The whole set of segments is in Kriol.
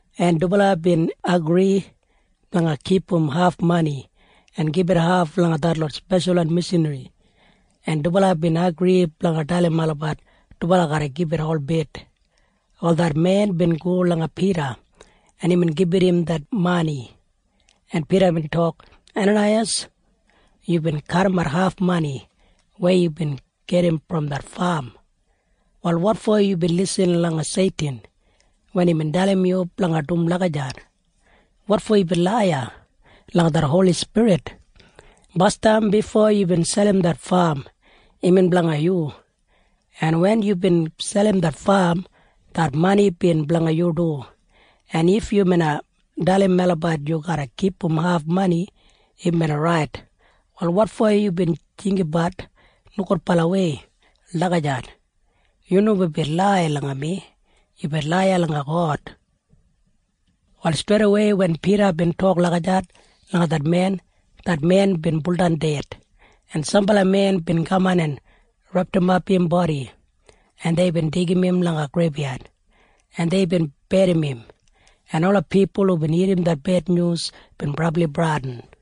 en dubala bin agri blanga kipum haf mani en gibit haf langa detlot speshalwan mishanri, en dubala bin agri blanga dalim olabat dubala garra gibit holbit. Wal det men bin go langa Pida, en imbin gibit im det mani, en Pida bin tok, “Enanaiyas, yubin kadimat haf mani weya yubin gedim brom det fam. Wal wotfo yubin lisin langa Seitin wen imbin dalim yu blanga dum lagijat? Wotfo yubin laiya langa det Holi Spirit? Basdam bifo yubin selim det fam, imbin blanga yu, en wen yubin selim det fam, det mani bin blanga yu du. En if yu bina dalim melabat yu garra kipum haf mani, im bina rait. Wal wotfo yubin jinggabat nogudbalawei lagijat? Yu nomo bin laiya langa mi. Yubin laiya langa God.” Wal streidawei wen Pida bin tok lagijat langa det men, det men bin buldan ded, en sambala men bin kaman en repdimap im bodi, en deibin deigim im langa greibyad, en deibin berrim im, en ola pipul hubin irrim det bednyus bin brabli bradin.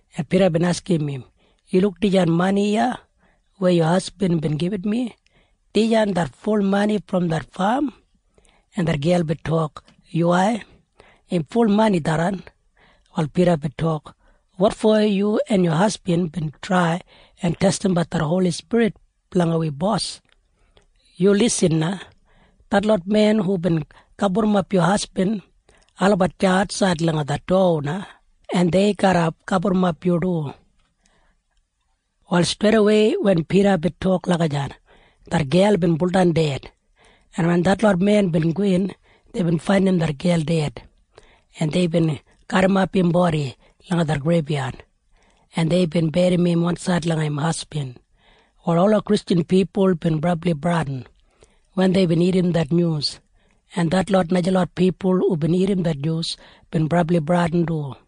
en Pida bin askim im, “Yu luk dijan mani iya weya yu hasbin bin gibit mi? Dijan det ful mani brom det fam?” En det gel bin tok, “Yuwai. Im ful mani tharran.” Wal Pida bin tok, “Wotfo yu en yu hasbin bin trai en testimbat det Holi Spirit blanga wi Bos? Yu lisin na. Detlot men hubin gaburrumap yu hasbin, olabat deya atsaid langa det dowa na, en dei garra gaburrumap yu du!” Wal streidawei wen Pida bin tok lagijat, det gel bin buldan ded, en wen detlot men bin gowin, deibin faindim det gel ded, en deibin garrimap im bodi langa det greibyad, en deibin berrim im wansaid langa im hasbin. Wal ola bilibamob bin brabli bradin wen deibin irrim det nyus, en detlot najalot pipul hubin irrim det nyus bin brabli bradin du.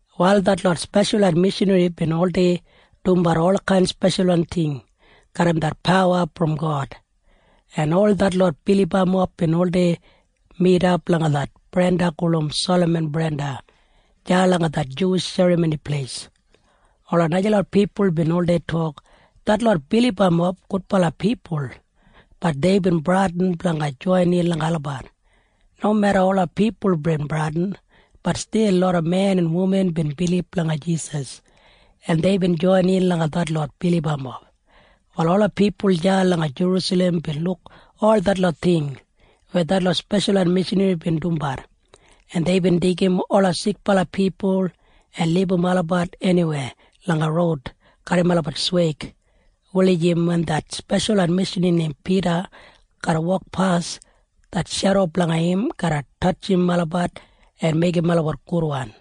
Wal detlot speshalwan mishanri bin oldei dumbat olkain speshalwan ting garram det pawa brom God, en ol detlot bilibamob bin oldei midap langa det brenda gulum Salaman Brenda deya langa det Juwish Serramoni Pleis. Ola najalot pipul bin oldei tok, “Detlot bilibamob gudbala pipul.” Bat deibin bradin blanga joinin langa olabat. Nomeda ola pipul bin bradin, bat stil loda men en wuman bin bilib langa Jisas, en deibin joinin langa detlot bilibamob. Wal ola pipul deya langa Jerusalem bin luk ol detlot ting weya detlot speshalwan mishanri bin dumbat, en deibin deigim ola sikbala pipul en libum olabat eniwei langa roud garram olabat sweig wulijim wen det speshalwan mishanri neim Pida garra wokpas, maitbi det shedo blanga im garra tatjim olabat en meigim olabat gudwan.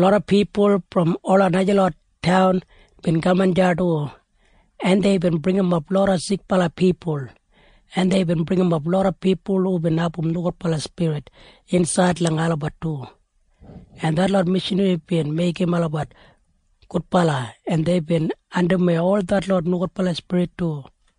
Loda pipul brom ola najalot taun bin kaman deya du, en deibin bringimap loda sikbala pipul, en deibin bringimap loda pipul hubin abum nogudbala spirit insaid langa olabat du, en detlot mishanri bin meigim olabat gudbala, en deibin andimwei ol detlot nogudbala spirit du.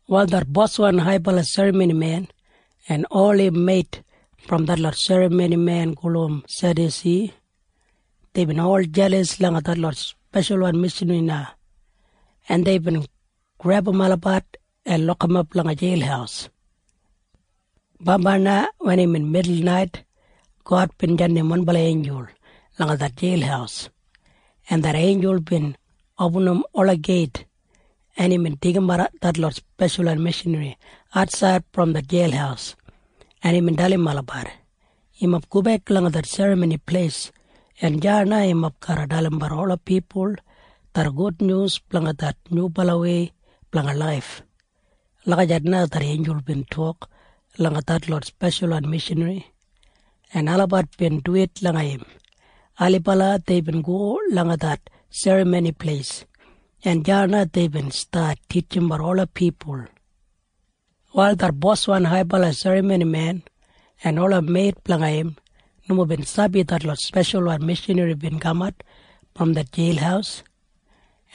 Wal det boswan haibala serramonimen en ol im meit brom detlot serramonimen gulum Sedyusi, deibin ol jelas langa detlot speshalwan mishanri na, en deibin grebum olabat en lokimap langa jeil. Bambai na wen imbin midulnait, God bin jandim wanbala einjul langa det jeil, en det einjul bin opinim ola geit, en imbin deigimat detlot speshalwan mishanri atsaid brom det jeil, en imbin dalim olabat, “Yumob gobek langa det Serramoni Pleis, en deya na yumob garra dalimbat ola pipul det gudnyus blanga det nyubalawei blanga laif.” Lagijat na det einjul bin tok langa detlot speshalwan mishanri, en olabat bin duwit langa im. Ailibala deibin go langa det Serramoni Pleis, en deya na deibin stat titjimbat ola pipul. Wal det boswan haibala serramonimen en ola meit blanga im nomo bin sabi detlot speshalwan mishanri bin kamat brom det jeil,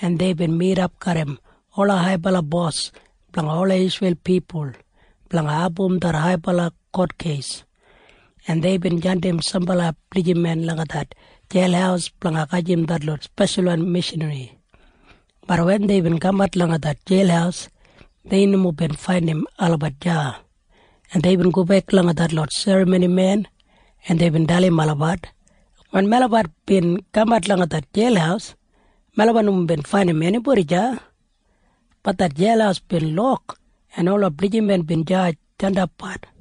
en deibin midap garram ola haibala bos blanga ola Isreil pipul blanga abum det haibala kotkeis, en deibin jandim sambala blijiman langa det jeil blanga gajim detlot speshalwan mishanri. Bat wen deibin kamat langa det jeil, dei nomo bin faindim olabat deya, en deibin gobek langa detlot serramonimen, en deibin dalim olabat, “Wen melabat bin kamat langa det jeil, melabat nomo bin faindim enibodi deya. Bat det jeil bin lok en ola blijiman bin deya jandapbat.”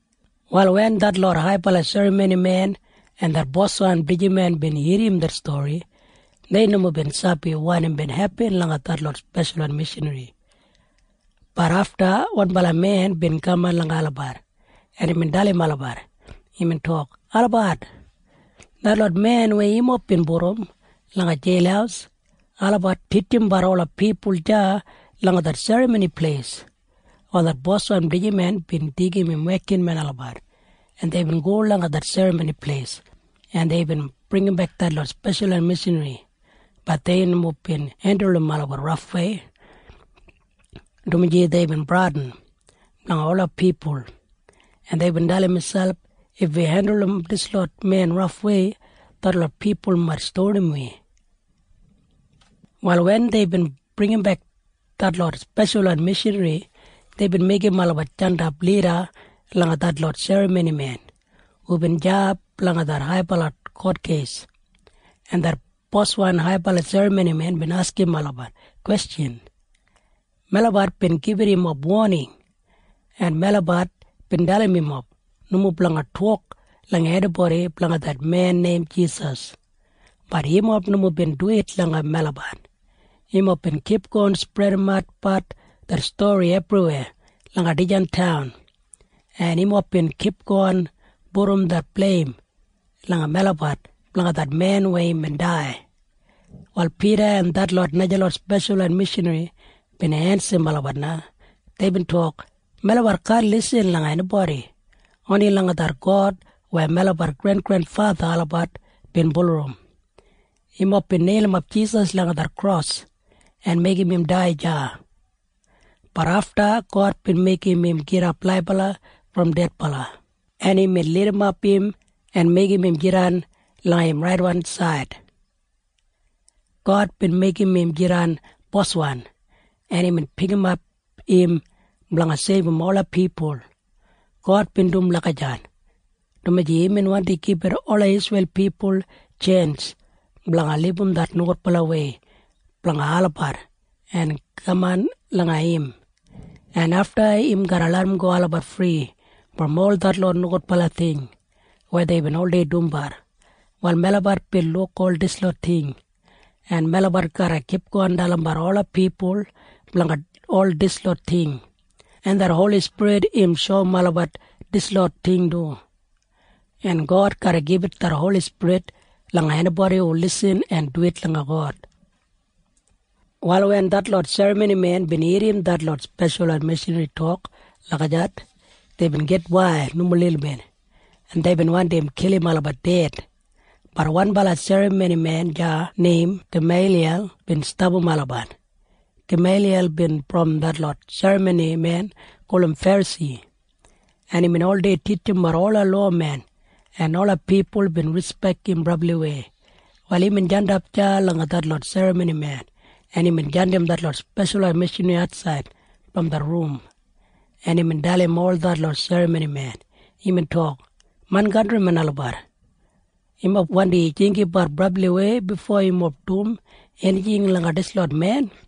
Wal wen detlot haibala serramonimen en det boswan blijiman bin irrim det stori, dei nomo bin sabi wanim bin hepin langa detlot speshalwan mishanri. Bat afta wanbala men bin kaman langa olabat, en imbin tok, “Olabat! Detlot men weya yumob bin pudum langa jeil, olabat titjimbat ola pipul deya langa det Serramoni Pleis.” Wal det boswan blijiman bin deigim im wekinmen olabat, en deibin go langa det Serramoni Pleis, en deibin bringimbek detlot speshalwan mishanri. Bat dei nomo bin hendulum olabat rafwei, dumaji deibin bradin blanga ola pipul, en deibin dalim miselp, “If wi hendulum dislot men rafwei, detlot pipul mait stonim wi.” Wal wen deibin bringimbek detlot speshalwan mishanri, deibin meigim olabat jandap lida langa detlot serramonimen hubin deya blanga det haibala kotkeis. En det boswan haibala serramonimen bin askim olabat kwestjan en deibin tok, “Melabat bin gibit yumob woning, en melabat bin dalim yumob nomo blanga tok langa enibodi blanga det men neim Jisas. Bat yumob nomo bin duwit langa melabat. Yumob bin kipgon spredimatbat det stori ebriweya langa dijan taun, en yumob bin kipgon pudum det bleim langa melabat blanga det men weya imbin dai.” Wal Pida en detlot najalot speshalwan mishanri bin ensim olabat na. Deibin tok, “Melabat kaan lisin langa enibodi. Oni langa det God weya melabat grengrenfatha olabat bin bulurrum. Yumob bin neilimap Jisas langa det kros en meigim im dai deya. Bat afta God bin meigim im gidap laibala brom dedbala, en imbin lidimap im en meigim im jidan langa im raidensaid. God bin meigim im jidan Boswan, en imbin pikimat im blanga seibum ola pipul. God bin dum lagijat, dumaji imbin wandi gibit ola Isreil pipul tjens blanga libum det nogudbalawei blanga olabat en kaman langa im, en afta im garra larramgo olabat fri brom ol detlot nogudbala ting weya deibin oldei dumbat. Wal melabat bin luk ol dislot ting, en melabat garra kipgon dalimbat ola pipul blanga ol dislot ting. En det Holi Spirit im shoum olabat dislot ting du. En God garra gibit det Holi Spirit langa enibodi hu lisin en duwit langa God.” Wal wen detlot serramonimen bin irrim detlot speshalwan mishanri tok lagijat, deibin gitwail nomo lilbit, en deibin wandi kilim olabat ded. Bat wanbala serramonimen deya neim Gameiliyal bin stapam olabat. Gameiliyal bin brom detlot serramonimen gulum Ferasi, en imbin oldei titjimbat ola lowamen, en ola pipul bin rispek im brabliwei. Wal imbin jandap deya langa detlot serramonimen, en imbin jandim detlot speshalwan mishanri atsaid brom det rum, en imbin dalim ol detlot serramonimen. Imbin tok, “Main kantrimen olabat, yumob wandi jinggabat brabliwei bifo yumob dum enijing langa dislot men.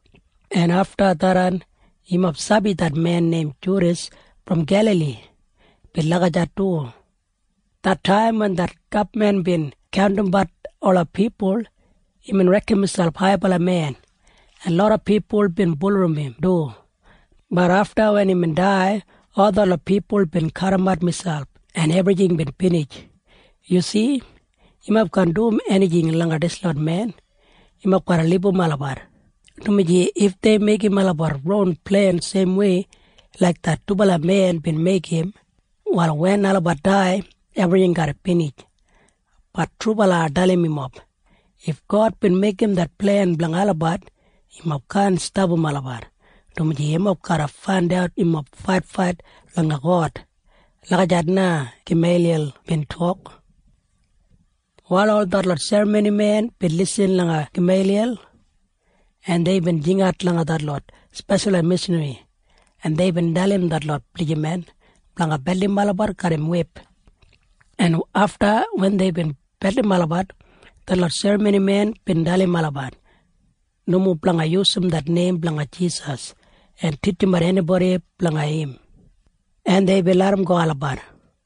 En afta tharran, yumob sabi det men neim Judas brom Gelali bin lagijat du. Det taim wen det gabman bin kaundimbat ola pipul, imbin reken miselp haibala men, en loda pipul bin bulurrum im du. Bat afta wen imbin dai, ol detlot pipul bin kadimat miselp, en ebrijing bin binij. Yu si? Yumob kaan dum enijing langa dislot men. Yumob garra libum olabat, dumaji if dei meigim olabat ron plen seimwei laik det dubala men bin meigim, wal wen olabat dai, ebrijing garra binij. Bat trubala ai dalim yumob. If God bin meigim det plen blanga olabat, yumob kaan stapam olabat, dumaji yumob garra faindat yumob faitfait langa God.” Lagijat na Gameiliyal bin tok. Wal ol detlot serramonimen bin lisin langa Gameiliyal, en deibin jingat langa detlot speshalwan mishanri, en deibin dalim detlot blijiman blanga beldim olabat garram wip. En afta wen deibin beldim olabat, detlot serramonimen bin dalim olabat nomo blanga yusum det neim blanga Jisas en titjimbat enibodi blanga im. En deibin larramgo olabat.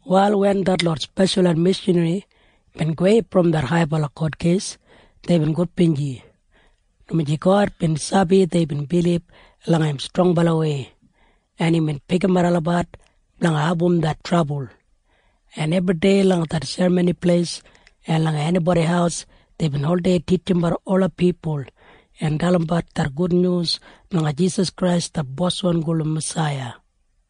Wal wen detlot speshalwan mishanri bin gowei brom det haibala kotkeis, deibin gudbinji, dumaji God bin sabi deibin bilib langa im strongbalawei, en imbin pikimat olabat blanga abum det trabul. En ebridei langa det Serramoni Pleis en langa enibodi haus deibin oldei titjimbat ola pipul en dalimbat det Gudnyus blanga Jisas Krais det Boswan gulum Masaiya.